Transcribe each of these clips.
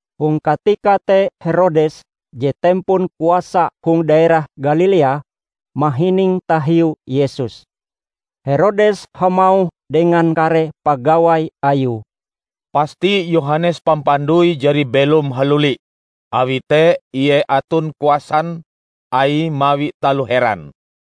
Hong katika te Herodes, je tempon kuasa hong daerah Galilea, mahining tahiu Yesus. Herodes hamauh dengan kare pagawai ayue, "Pasti Yohanes Pampandoi jari belom haluli! Awi te Ie aton kuasan Aie mawi taloh heran."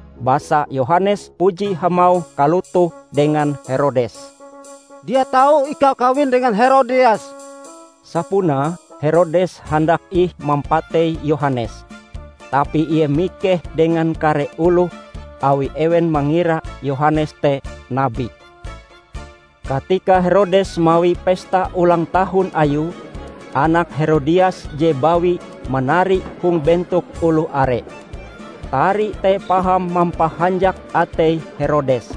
Basa Yohanes puji hamauh kalotoh dengan Herodes, "Dia tau ikau kawin dengan Herodias!" Sapunae Herodes handak ih mampatei Yohanes, tapi ie mikeh dengan kare oloh awi ewen mangira Yohanes te nabi. Katika Herodes mawi pesta ulang tahun ayue, anak Herodias je bawi manari hong bentok oloh are. Tarie te paham mampahanjak atei Herodes,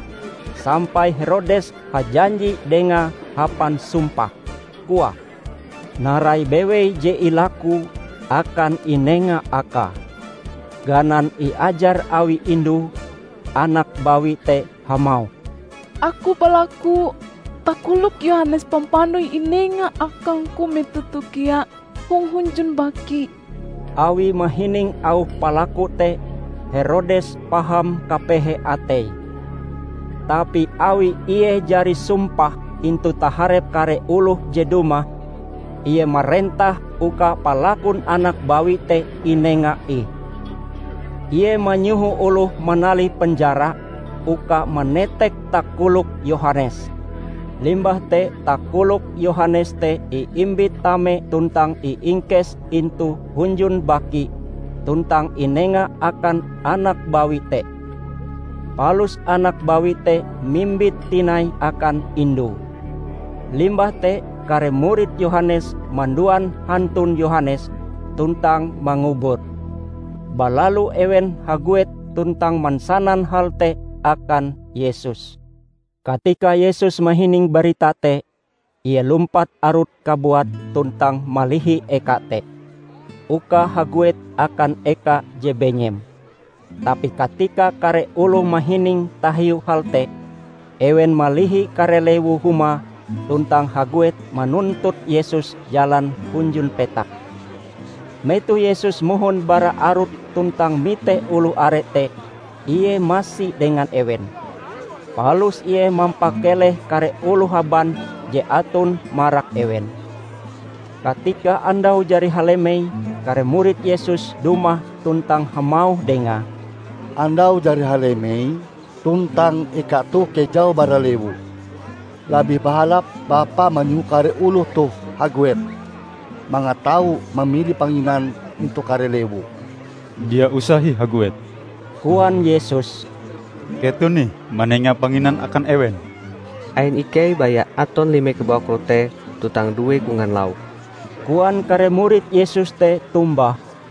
sampai Herodes hajanji dengae hapan sumpah, koae, narai bewei je ilakue, akan inenga akae. Ganan iajar awi indue, anak bawi te hamauh, "Aku balaku takolok Yohanes Pampandoi inenga akangku metoh toh kea hong hunjun baki!" Awi mahining auh palaku te, Herodes paham kapehe ateie. Tapi awi ie jari sumpah intu taharep kare oloh je dumah, ie marentah uka palakun anak bawi te inenga ih. Ie manyoho oloh manalih penjara uka manetek takolok Yohanes. Limbah te takolok Yohanes te iimbit tame tuntang iingkes intu hunjun baki tuntang inenga akan anak bawi te. Palus anak bawi te mimbite tinai akan indue. Limbah te kare murid Yohanes manduan hantun Yohanes tuntang mangubure. Balalu ewen haguet tuntang mansanan hal te akan Yesus. Katika Yesus mahining barita te, Ie lumpat arut kabuate tuntang malihi eka te, uka haguet akan eka je benyem. Tapi katika kare oloh mahining tahiu hal te, ewen malihi kare lewu-humae tuntang haguet manuntut Yesus jalan hunjun petak. Metoh Yesus mohon bara arut tuntang mite oloh are te, Ie masi dengan ewen. Palus Ie mampakeleh kare oloh haban je aton marak ewen. Katika andau jari halemei kare murid Yesus dumah tuntang hamauh Dengae, "Andau jari halemei tuntang eka toh kejau bara lewu. Labih bahalap Bapa manyoho kare oloh toh haguet, mangat tau mamili panginan intu kare lewu." "Dia usah ih haguet," koan Yesus, "Keton ih manenga panginan akan ewen." "Ain ikei baya aton lime kabawak rote tuntang due kongan lauk!" koan kare murid Yesus te tombah.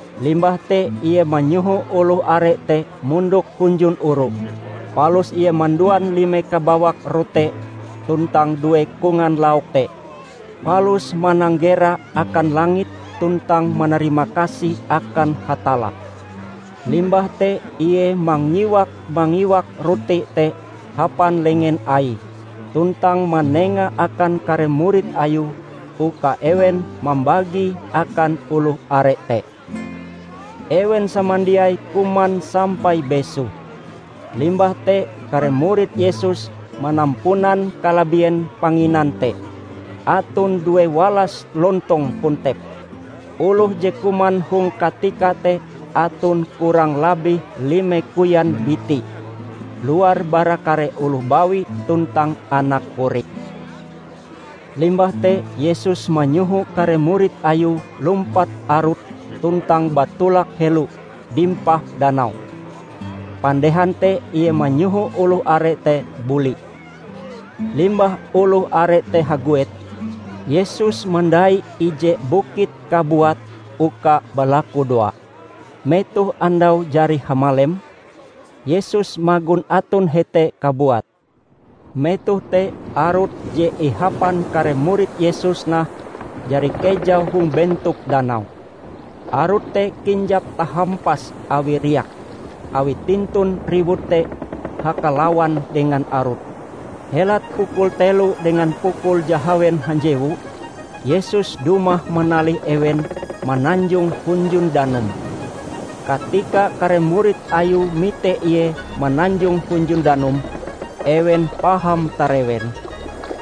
Limbah te Ie manyoho oloh are te mondok hunjun oru, palus Ie manduan lime kabawak rote tuntang due kongan lauk te, palus mananggera akan langit tuntang manarimakasih akan Hatalla. Limbah te Ie mangiwak-mangiwak rote te hapan lengen Aie tuntang manengae akan kare murid Ayue uka ewen mambagie akan oloh are te. Ewen samandiai kuman sampai besoh. Limbah te kare murid Yesus manampunan kalabien panginan te; aton due walas lontong kontep. Oloh je kuman hong katika te aton kurang labih lime koyan biti, luar bara kare oloh bawi tuntang anak korik. Limbah te Yesus manyoho kare murid Ayue lumpat arut tuntang batolak helo dimpah danau, pandehan te Ie manyoho oloh are te buli. Limbah oloh are te haguet, Yesus mandai ije bukit kabuate uka balaku doa. Metoh andau jari hamalem, Yesus magon aton hete kabuat. Metoh te arut je ihapan kare murid Yesus nah, jari kejau hong bentok danau. Arut te kinjap tahampas awi riak, awi tintun riwut te hakalawan dengan arut. Helat pukul telo dengan pukul jahawen hanjewu, Yesus dumah manalih ewen mananjong hunjun danum. Katika kare murid Ayue mite Ie mananjong hunjun danum, ewen paham tarewen.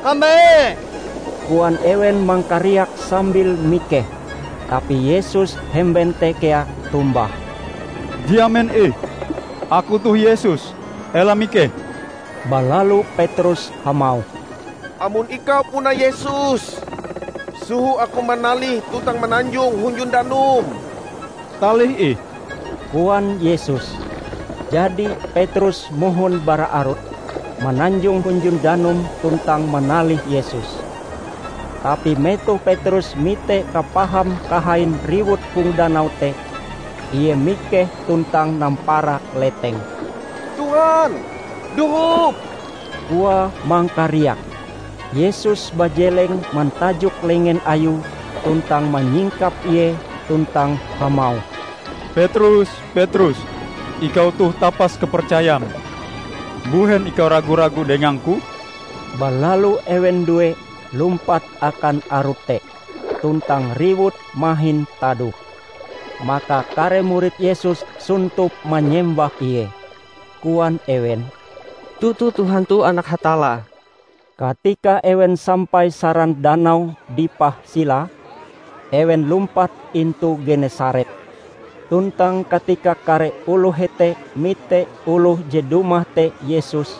"Kambe!" koan ewen mangkariak sambil mikeh. Tapi Yesus hemben te kea tombah, "Dia men ih! Aku toh Yesus. Ela mikeh!" Balalu Petrus hamauh, "Amon ikau puna Yesus, soho aku manalih tuntang mananjong hunjun danum." "Talih ih," koan Yesus. Jadi Petrus mohon bara arut, mananjong hunjun danum tuntang manalih Yesus. Tapi metoh Petrus mite kapaham kahain riwut hong danau te, ie mikeh tuntang nampara leteng. "Tuhan, dohop!" koae mangkariak. Yesus bajeleng mantajok lengen Ayue tuntang manyingkap ie tuntang hamauh, "Petrus, Petrus, ikau toh tapas kapercayam. Mbuhen ikau ragu-ragu dengang-Ku?" Balalu ewen due lumpat akan arut te, tuntang riwut mahin tadoh. Maka kare murid Yesus sontop manyembah Ie. Koan ewen, "Toto Tuhan toh Anak Hatalla!" Katika ewen sampai saran danau dipah silae, ewen lumpat intu Genesaret. Tuntang katika kare oloh hete mite oloh je dumah te Yesus,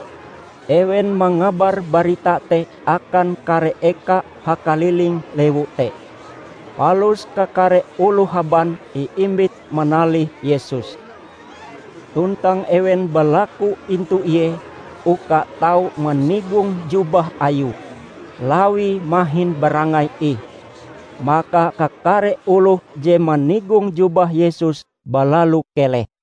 ewen mangabar barita te akan kare eka hakaliling lewu te. Palus kakare oloh haban iimbit manalih Yesus. Tuntang ewen balaku intu Ie uka tau manigong jubah Ayue, lawie mahin barangai ih. Maka kakare oloh je manigong jubah Yesus balalu keleh.